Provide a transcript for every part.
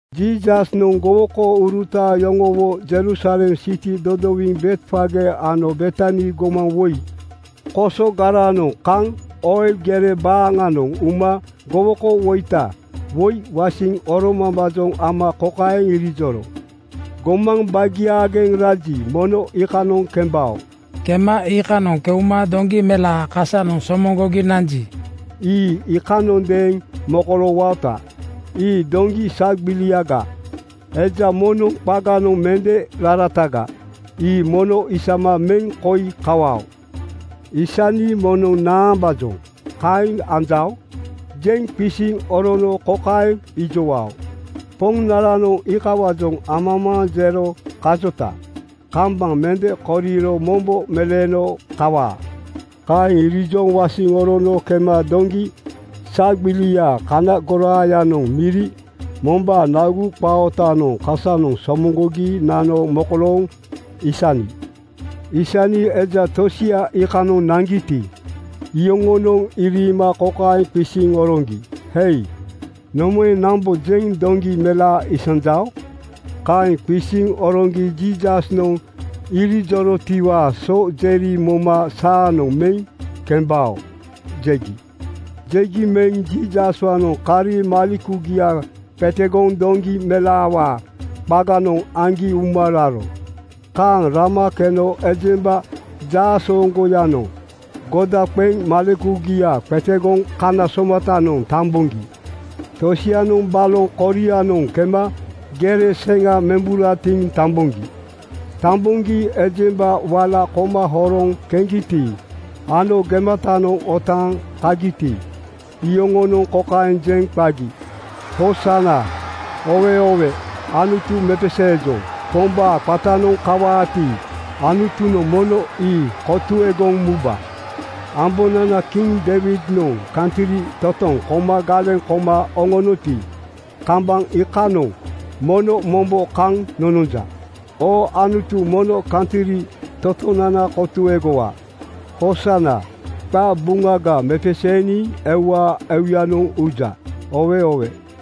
Jiisasnoŋ gowokouruta yoŋowo Jerusalem siti dodowiŋ Betfage ano Betani gomaŋ woi kosogaranoŋ kaŋ Oil gere baaŋanoŋ uma gowokowoita woi wasiŋ oromambaajoŋ ama kokaeŋ irijoro, “Gomaŋ bagiaageŋ raji, mono iikanoŋ kembao. Kema iikanoŋ keuma doŋgi melaa kasanoŋ somoŋgogi nanji, ii iikanondeeŋ mokoloowaota. Ii doŋgi sagbiliaga, eja moŋnoŋ qaganoŋ mende rarataga. Ii mono isama meŋ koi kawao. Aisni moŋnoŋ ‘Naambaajoŋ kaeŋ anjao?’ jeŋ qisiŋ orono kokaeŋ ijowao, ‘Poŋnaranoŋ iikawaajoŋ amamaaŋ jero kajota kambaŋ mende koriro mombo meleeno kawaa.” ’ Kaeŋ irijoŋ wasiŋ orono kema doŋgi sagbilia kana goraayanoŋ miri mombaa nagu qaa ootanoŋ kasanoŋ somoŋgogi nano mokolooŋ isani. Aisni eja tosia iikanoŋ naŋgiti, iyoŋonoŋ iriima kokaeŋ qisiŋ oroŋgi, “Hei, nomaeŋ nambojeŋ doŋgi melaa isanjao?” Kaeŋ qisiŋ oroŋgi Jiisasnoŋ irijorotiwaa so jeri moma “Saanoŋ meŋ kembao,” jegi. Jegi meŋ Jiisaswaanoŋ kari malekugia qetegoŋ doŋgi melaawaa qaganoŋ aŋgi uma raro. Kaaŋ rama keno ejemba jaasooŋgoyanoŋ goda qeŋ malekugia qetegoŋ kana somatanoŋ tamboŋgi tosianoŋ baloŋ korianoŋ kema gere seŋa memburatiŋ tamboŋgi. Tamboŋgi ejemba wala koma horoŋ keŋgiti ano gematanoŋ otaaŋ kagiti, iyoŋonoŋ kokaeŋ jeŋ qagi, “Hoosana! Oowe oowe! Anutu mepeseejoŋ. Pombaa qatanoŋ kawaati, Anutunoŋ mono ii kotuegoŋ muba. Ambonana Kiŋ Deiwidnoŋ kantri totoŋ koma galeŋ koma oŋonoti, kambaŋ iikaaŋanoŋ mono mombo kaŋ nononja. Oo Anutu mono kantri totonana kotuegowa. Hoosana! Qabuŋaga mepeseeniŋ euwaa euyanoŋ uja. Oowe oowe!”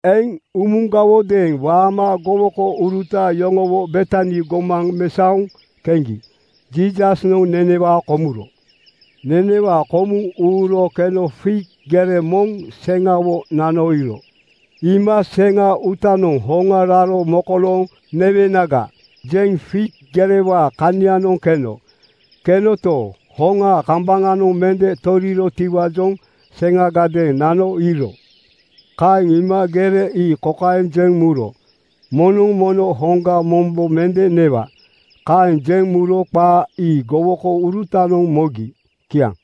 Eŋ umugawodeeŋ waama gowokouruta yoŋowo Betani gomaŋ mesaoŋ keŋgi Jiisasnoŋ nenewaa komuro. Nenewaa komuŋ uuro keno fig gere moŋ seŋawo nano iiro. Iima “Seŋa uutanoŋ hoŋa raro mokolooŋ newenaga,” jeŋ fig gerewaa kanianoŋ keno. Kenoto, hoŋaa kambaŋanoŋ mende torirotiwaajoŋ seŋagadeeŋ nano iiro. Kaeŋ iima gere ii kokaeŋ jeŋ muro, “Moŋnoŋ mono hoŋga mombo mende newa.” Kaeŋ jeŋ muro qaa ii gowokourutanoŋ mogi. Kiaŋ.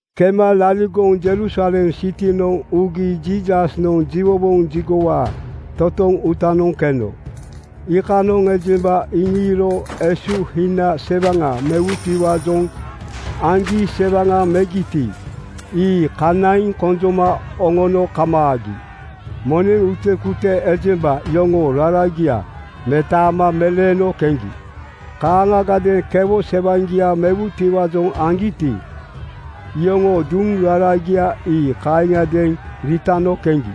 Kema laligoŋ Jerusalem sitinoŋ ugi Jiisasnoŋ jiwowoŋ jigowaa totoŋ uutanoŋ keno. Iikanoŋ ejemba iŋiiro esuhina sewaŋa mewutiwaajoŋ aŋgi sewaŋa megiti, ii kanaiŋ konjoma oŋono kamaagi. Moneŋ utekute ejemba yoŋoo raragia metaama meleeno keŋgi. Kaaŋagadeeŋ kewo sewaŋgia mewutiwaajoŋ aŋgiti, iyoŋoo duŋ raragia ii kaaŋiadeeŋ riitano keŋgi.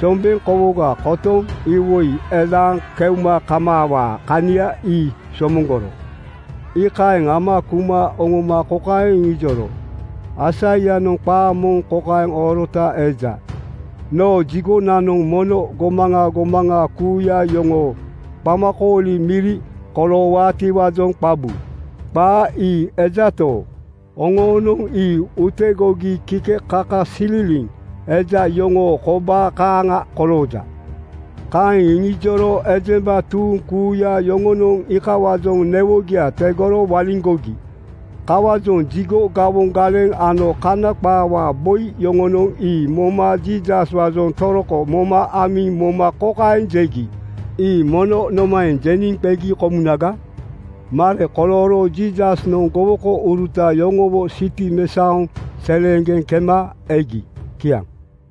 Sombeŋ kowoga kotoŋ iwoi elaaŋ keuma kaamawaa kania ii somoŋgoro. Iikaeŋ ama kuma oŋoma kokaeŋ iŋijoro, “Aisaianoŋ qaa moŋ kokaeŋ oorota eja, ‘Noo jigonanoŋ mono gomaŋa gomaŋa kuuya yoŋoo qamakooli miri koloowaatiwaajoŋ qabu.’ Qaa ii ejato, oŋonoŋ ii utegogi kikekakasililiŋ eja yoŋoo kobaa kaaŋa kolooja.” Kaeŋ iŋijoro ejemba tuuŋ kuuya yoŋonoŋ iikawaajoŋ newogia tegoro waliŋgogi. Kawaajoŋ jigo gawoŋ galeŋ ano kana qaawaa boi yoŋonoŋ ii moma Jiisaswaajoŋ toroko moma amiŋ moma kokaeŋ jegi, “Ii mono nomaeŋ jeniŋ qegi komunaga?” Mare kolooro Jiisasnoŋ gowokouruta yoŋowo siti mesaoŋ seleeŋgeŋ kema egi. Kiaŋ.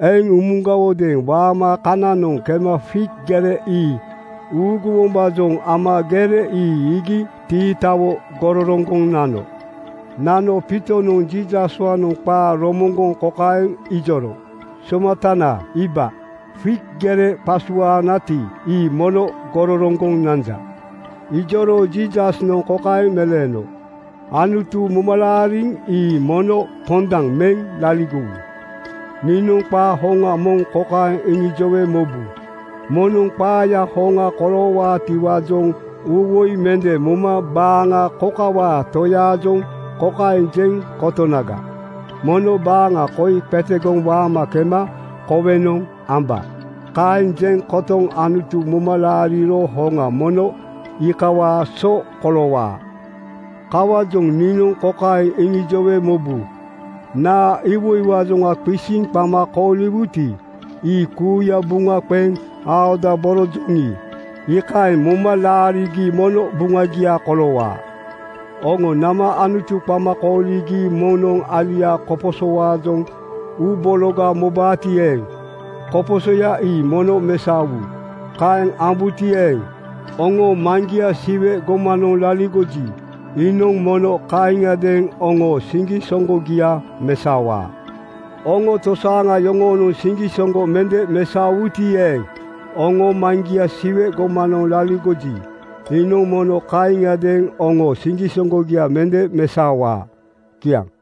Eŋ umugawodeeŋ waama kananoŋ kema fig gere ii uuguwombaajoŋ ama gere ii iigi tiitawo gororoŋgoŋ nano. Nano Piitonoŋ Jiisaswaanoŋ qaa romoŋgoŋ kokaeŋ ijoro, “Somatana iiba, fig gere qasuaanati, ii mono gororoŋgoŋ nanja.” Ijoro Jiisasnoŋ kokaeŋ meleeno, “Anutu momalaariŋ ii mono pondaŋ meŋ laligowu.” Niinoŋ qaa hoŋa moŋ kokaeŋ iŋijowe mobu, “Moŋnoŋ qaayaa hoŋa koloowaatiwaajoŋ uuwoi mende moma baaŋa kokawaa toyaajoŋ kokaeŋ jeŋ kotonaga, ‘Mono baaŋa koi qetegoŋ waama kema kowenoŋ amba.’ Kaeŋ jeŋ kotoŋ Anutu moma laariro hoŋa mono iikawaa so koloowaa. Kawaajoŋ niinoŋ kokaeŋ iŋijowe mobu: Naa iwoiwaajoŋ qisiŋ qama kooliwuti, ii kuuya buŋa qeŋ aodaborojoŋi, iikaeŋ moma laarigi mono buŋagia koloowaa. Oŋo nama Anutu qama kooligi moŋnoŋ aliaa koposowaajoŋ uubologa mobaati eeŋ, koposoya ii mono mesaowu. Kaeŋ ambuti eeŋ, oŋoo Maŋgia Siwe gomanoŋ laligoji, iinoŋ mono kaaŋiadeeŋ oŋoo siŋgisoŋgogia mesaowaa. (Oŋo tosaaŋa yoŋoonoŋ siŋgisoŋgo mende mesaowuti eeŋ, oŋoo Maŋgia Siwe gomanoŋ laligoji, iinoŋ mono kaaŋiadeeŋ oŋoo siŋgisoŋgogia mende mesaowaa.)” Kiaŋ.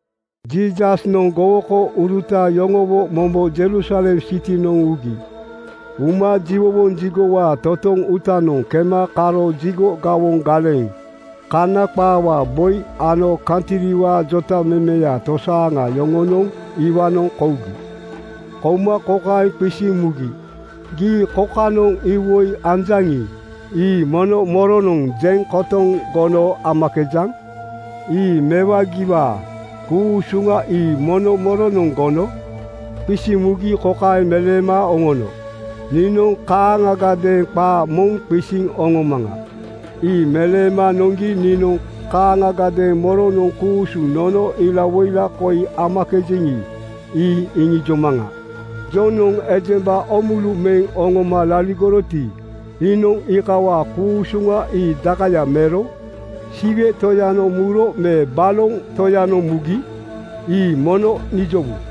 Jiisasnoŋ gowokouruta yoŋowo mombo Jerusalem sitinoŋ ugi. Uma jiwowoŋ jigowaa totoŋ uutanoŋ kema karo jigo gawoŋ galeŋ, kana qaawaa boi ano kantriwaa jotamemeya tosaaŋa yoŋonoŋ iwaanoŋ kougi. Kouma kokaeŋ qisiŋ mugi, “Gii kokanoŋ iwoi anjaŋi, ii mono moronoŋ jeŋ kotoŋ gono amakejaŋ? Ii mewagiwaa ku-usuŋa ii mono moronoŋ gono?” Qisiŋ mugi kokaeŋ meleema oŋono, “Niinoŋ kaaŋagadeeŋ qaa moŋ qisiŋ oŋomaŋa. Ii meleema noŋgi niinoŋ kaaŋagadeeŋ moronoŋ ku-usuŋ nono ilawoila koi amakejeŋi, ii iŋijomaŋa. Jonoŋ ejemba oomulu meŋ oŋoma laligoroti, iinoŋ iikawaa ku-usuŋa ii dakaya mero? Siwe Toyanoŋ muro me boloŋ toyanoŋ mugi? Ii mono nijowu.”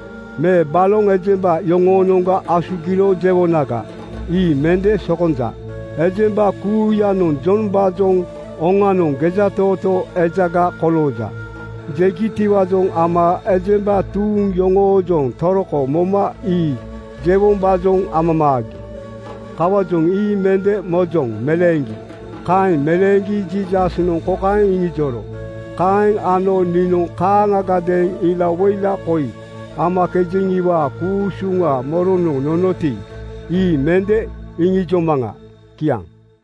Me ‘Baloŋ ejemba yoŋoonoŋga asugiro,’ jewonaga? Ii mende sokonja.” Ejemba kuuyanoŋ Jombaajoŋ ‘Oŋanoŋ gejatootoo ejaga kolooja,’ jegitiwaajoŋ ama ejemba tuuŋ yoŋoojoŋ toroko moma ii jewombaajoŋ amamaagi. Kawaajoŋ “Ii mende mojoŋ,” meleeŋgi. Kaeŋ meleeŋgi Jiisasnoŋ kokaeŋ iŋijoro, “Kaeŋ ano niinoŋ kaaŋagadeeŋ ilawoila koi amakejeŋiwaa ku-usuŋa moronoŋ nonoti, ii mende iŋijomaŋa.” Kiaŋ.